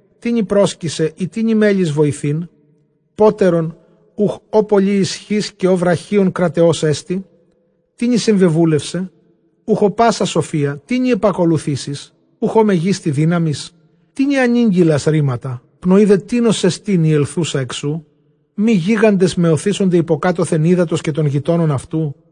Τίνι πρόσκεισαι, ἢ τίνι μέλλεις βοηθεῖν; πότερον οὐχ ᾧ πολλὴ ἰσχὺς, καὶ ᾧ βραχίων κραταιός ἐστι; Τίνι συμβεβούλευσαι; οὐχ ᾧ πᾶσα σοφία; τίνι ἐπακολουθήσεις; οὐχ ᾧ μεγίστη δύναμις; Τίνι ἀνήγγειλας ῥήματα; πνοὴ δὲ τίνος ἐστὶν ἡ ἐξελθοῦσα ἐκ σοῦ; Μὴ γίγαντες μαιωθήσονται ὑποκάτωθεν ὕδατος καὶ τῶν γειτόνων αὐτοῦ;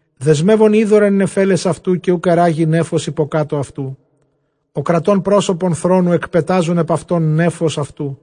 Δεσμεύων ὕδωρ ἐν νεφέλαις αὐτοῦ, καὶ οὐκ ἐῤῥάγη νέφος ὑποκάτω αὐτοῦ· Ὁ κρατῶν πρόσωπον θρόνου, ἐκπετάζων ἐπʼ αὐτὸν νέφος αὐτοῦ.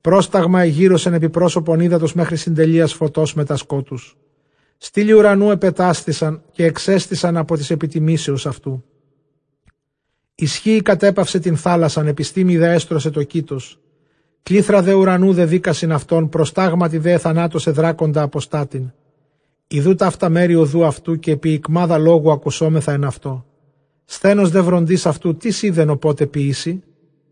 Πρόσταγμα ἐγύρωσεν ἐπὶ πρόσωπον ὕδατος, μέχρι συντελείας φωτὸς μετὰ σκότους. Στύλοι οὐρανοῦ ἐπετάσθησαν, καὶ ἐξέστησαν ἀπὸ τῆς ἐπιτιμήσεως αὐτοῦ. Ἰσχύϊ κατέπαυσε τὴν θάλασσαν, ἐπιστήμῃ δὲ ἔστρωται τὸ κῆτος. Κλεῖθρα δὲ οὐρανοῦ δεδοίκασιν αὐτόν· προστάγματι δὲ ἐθανάτωσε δράκοντα ἀποστάτην. Ἰδοῦ ταῦτα μέρη ὁδοῦ αὐτοῦ, καὶ ἐπὶ ἰκμάδα λόγου ἀκουσόμεθα ἐν αὐτῷ· σθενὸς δὲ βροντῆς αὐτοῦ, τίς οἶδεν ὁπότε ποιήσει;